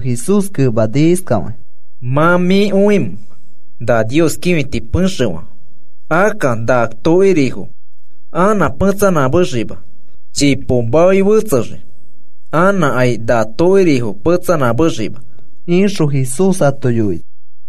Jesús kemani iskafakĩ: “¿Mã mĩ õimẽ na Nios kĩfiti pexefo? Akka, ¿na tokirifo anã petsanamexima chipo maoi fetsexii anãkai na tokirifo petsanãmexima?” ixõ Jesús ato yoini.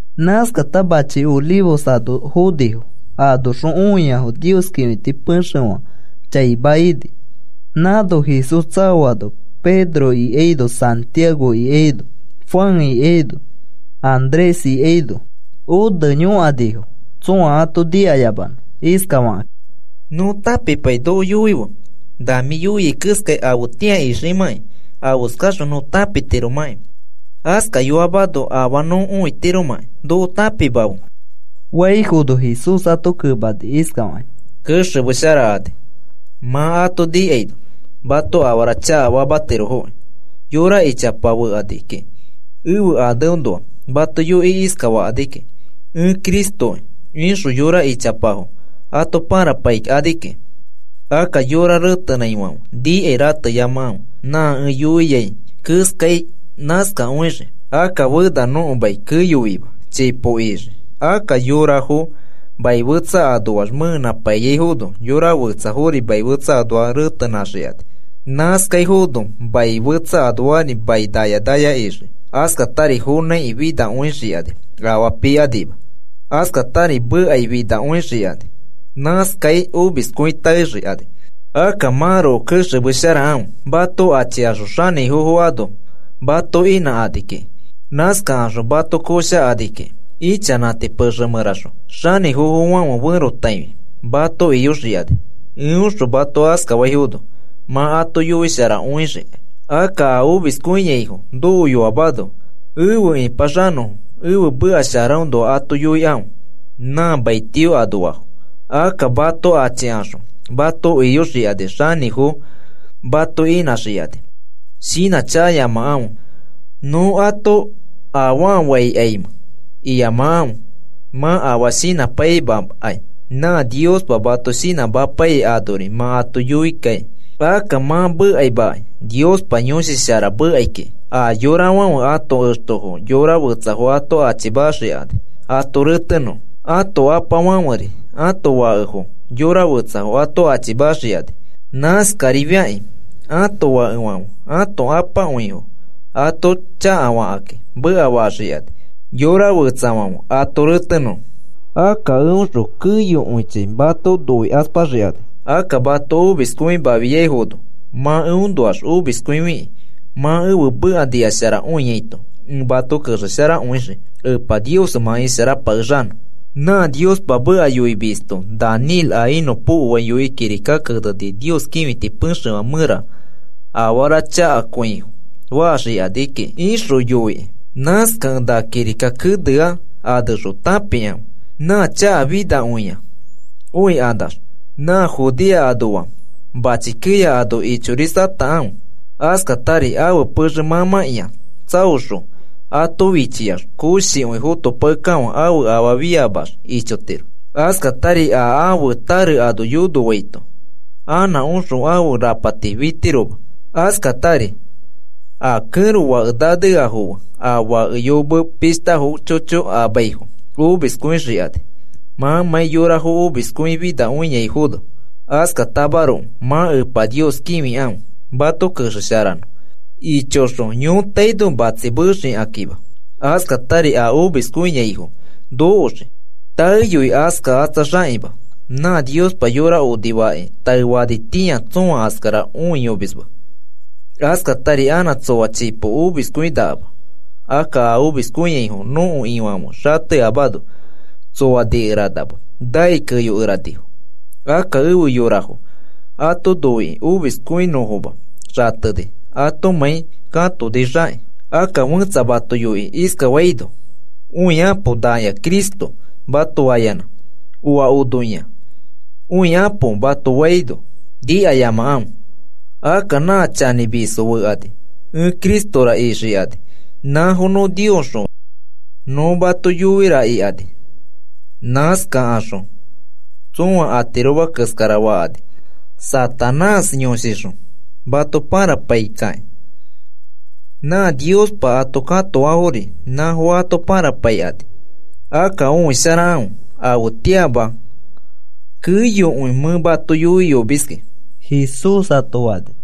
Nãskakata machi Olivos ano fonifo, anoxõ õiafo Nios kĩfiti pexefã chaima ini. Nãno Jesús tsaoano, Pedro ikaino, Santiago ikaino, Juan ikaino, Andrés ikaino one yõkanifo tsõa ato nikayamanõ iskafakakĩ: “Nõ tãpipaikai noko yoife. Na mĩ yoiai keskai afetĩa iximãkai, afeskaxõ nõ tãpitiromakĩ. Askayoamano afaa nõ õitiromakĩ noko tãpimafe,” faifono, Jesús ato kemani iskafakĩ: “Kexemesharakani mã ato nikaino mato afara chakafamatirofokĩ. Yora ichapafo fekani kiki, ẽfe aneõnoa mato yoikĩ iskafakani kiki. ‘Ẽ Cristoki,’ ikaxõ yora ichapafo ato pãrapaikani kiki. “Akka yorafo retenãifãfe nikai rateyamakãfe. Nã ẽ yoiai keskai nãskakõixii. Akka fena nõko mai keyoima, chipo ixii. Akka yorafo mai fetsa anoax mẽenãpaiyaifono, yora fetsafori mai fetsa anoax retenãxikani. Nãskaifono mai fetsa anoax mai naya naya ixii. Askatari fonãiki finakõixikani afaa pikanima. Askatari mekai finakõixikani. Nãskai omiskõi taexikani. “Akka mãroko kexemesharakãfe. Mato achikaxõ xanĩfofo mato inãkani kiki, nãskakaxõ mato koshakani kiki ichanãti pexe mẽraxõ. Xanĩfofofãfe ferotaifi mato iyoxikani. Eõxõ mato askafaifono, mã ato yoisharakõixikai. Akka a omiskõiaifo nokoyoamano efe ĩpaxanõfo ẽfe meka sharaõnoa ato yoikãfe, nã mai tio anoafo. Akka mato achikaxõ mato iyoxikani, xanĩfofo mato inãxikakĩ. Shinãchakayamakãfe nõ ato afaa faikaimẽ iyamakãfe. Mã afaa shinãpaimakai, nã Niospa mato shinãmapaiyai anori mã ato yoikai. Akka mã mekaimakai Niospa Yõshi Shara mekai kiki. A yorafãfe ãto extofo yora fetsafo ato achimaxikani ato retenõfo. Ato apafãferi ãto fakefo yora fetsafo ato achimaxikani. Nãskarifiakĩ ãto fakefãfe ãto apakõifo ato chakafakĩ mekafaxikani, yora fetsafãfe ato retenõfo. Akka eõxõ keyokõichi mato noikaspaxikani. Akka mato noikaspafiaifono mã eõnoax omiskõifiki mã ẽfe meka nikasharakõiaito ẽ mato kexesharakõixii Epa Nios fe mã isharapakexanõ. “Nã Niospa meka yoimisto Daniel a inõpokoai yoikĩ kirika keneni Nios kĩfiti pexefã mẽra afara chakakõi faxikani kiki ixõ yoikĩ. (Nãskakẽ na kirika kenea anexõ tãpikãfe.) Nã chakafinakõia õikanax, nã Judea anoafo machi keya ano ichorisatakãfe. Askatari ãfe pexe mãmãkĩa tsaoxõ ato fichiax koshikõi fotopakekafã ãfe afaa fiamax ichotiro. Askatari a ãfe tare ano yonoaito anã oxõ ãfe rapati fitiroma. Askatari a kẽro fake naneafo fe a fake yome pishta chocho amaifo omiskõixikani mãmãi yorafo omiskõifinakõiaifono. Askatamaroko mã Epa Nios kĩfikãfe mato kexesharanõ ichoxõ yõtaino matsi mexikakĩma. Askatari a omiskõiaifo nokoxii, taeyoi askakatsaxakĩma. Nã Niospa yora onifakĩ taefanitĩa tsõa askara õiyomisma. Askatari anã tsoa chipo omiskõinakama. Akka a omiskõiaifo nõko Ifãfe xateyamano, tsoa nikeranama nai keyokeranifo. Akka afe yorafo ato noikĩ omiskõinõfoma xateni atomãi katonixakĩ. “Akka fẽtsa mato yoikĩ iskafaino: ‘Õikapo nakĩa Cristo,’ mato fayanã: ‘Oa onokĩa, õikapo,’ mato faito nikayamakãfe. Akka nã chanĩmisfo fekani, ẽ Cristora ixikani, nãfo nõ Niosxõ nõ mato yoira ikani. Nãskakaxõ tsõa atiroma keskara fakani Satanás yõshixõ mato pãrapaikakĩ. Nã Niospa ato katoafori nãfo ato pãrapaikani. Akka õisharakãfe afetĩama keyokõi mẽ mato yoiyomiski,” Jesús ato fani.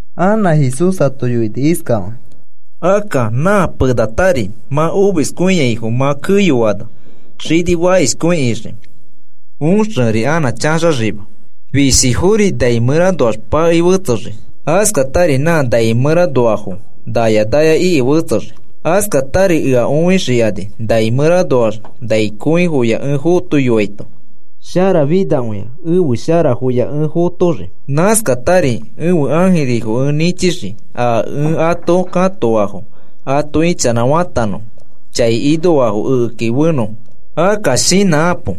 Anã Jesús ato yoini iskafakĩ: “Akka nã penatari, nã omiskõiaifo mã keyoano, xini fakishkõi ixii, oxeri anã chaxaxima. Fishifori nai mẽranoax pakei fetsexii, askatari nã nai mẽranoafo naya naya iki fetsexii. Askatari ea õixikani nai mẽranoax nai kõifoya ẽ fotoaito sharafinakõia ẽfe sharafoya ẽ fotoxii. Nãskatari ẽfe ãjirifo ẽ nĩchixii a ẽ ato katoafo ato ichanãfatanõfo, a chai ikafo ekeki efenõfo. “Akka shinãkapo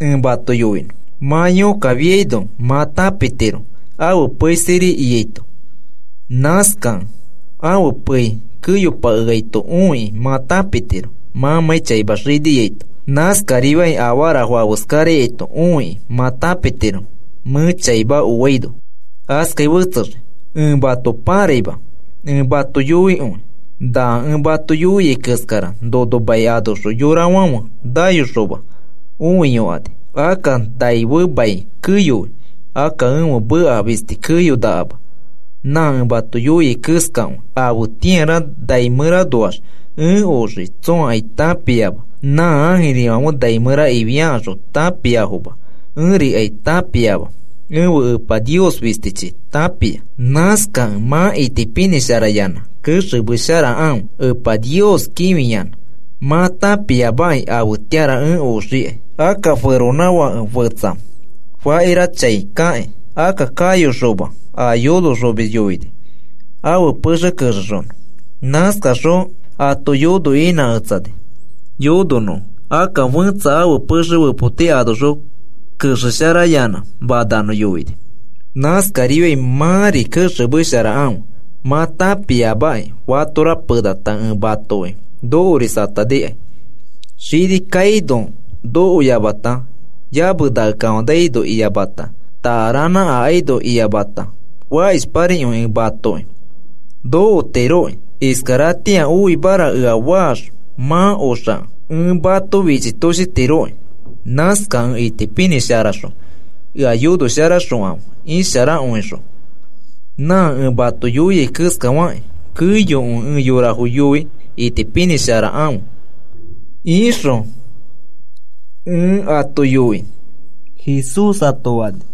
ẽ mato yoinõ. Mã yõkkafiaino mã tãpitiro ãfe pei sirikiaito. Nãskakẽ ãfe peifo keyopaito õikĩ mã tãpitiro mãmãi chaima xiniaito. Nãskarifiakĩ afarafo afeskaraito õikĩ mã tãpitiro mẽ chaima oaino askai fetsexii. Ẽ mato pãraima ẽ mato yoikõi, na ẽ mato yoiai keskara nono mai anoxõ yorafãfe nayokaxõma õiyokani. Akka nai fe mai keyoi. Akka ẽfe meka fisti keyonakama, nã ẽ mato yoiai keskakõi. “Afetĩara nai mẽranoax ẽ oxii tsõakai tãpiama. Nã ãjirifãfe nai mẽra ifiakaxõ tãpiafoma. Ẽrikai tãpiama. Ẽfe Epa Nios fistichi tãpia. “Nãskakẽ mã itipinĩsharayanã kexemesharakãfe Epa Nios kĩfiyanã. Mã tãpiamaki afetĩara ẽ oxikai. Akka feronãfake fẽtsa fakira chaikakĩ, akka kayoxoma a yonoxomisfo yoini ãfe pexe kexexonõfo. Nãskaxõ ato yono inãketsani yononõfo, akka fẽtsa ãfe pexe fepoti anoxõ kexesharayanã mananõ yoini. Nãskarifiai mãri kexemesharakãfe, mã tãpiamaki fatora penata ẽ matoki nokorisatanikai. Xini kaino nokoyamata, yamenakefanaino iyamata, takaranã akaino iyamata, fakishparikõi ẽ matoki nokotiroki. Iskaratĩa oimara ea faax mã oxakẽ ẽ mato fichitoshitiroki, nãskakẽ itipinĩsharaxõ ea yonoxosharakãfe isharakõixõ. Nã ẽ mato yoiai keskafakĩ, keyokõi ẽ yorafo yoi itipinĩsharakãfe ixõ ẽ ato yoi,” Jesús ato fani.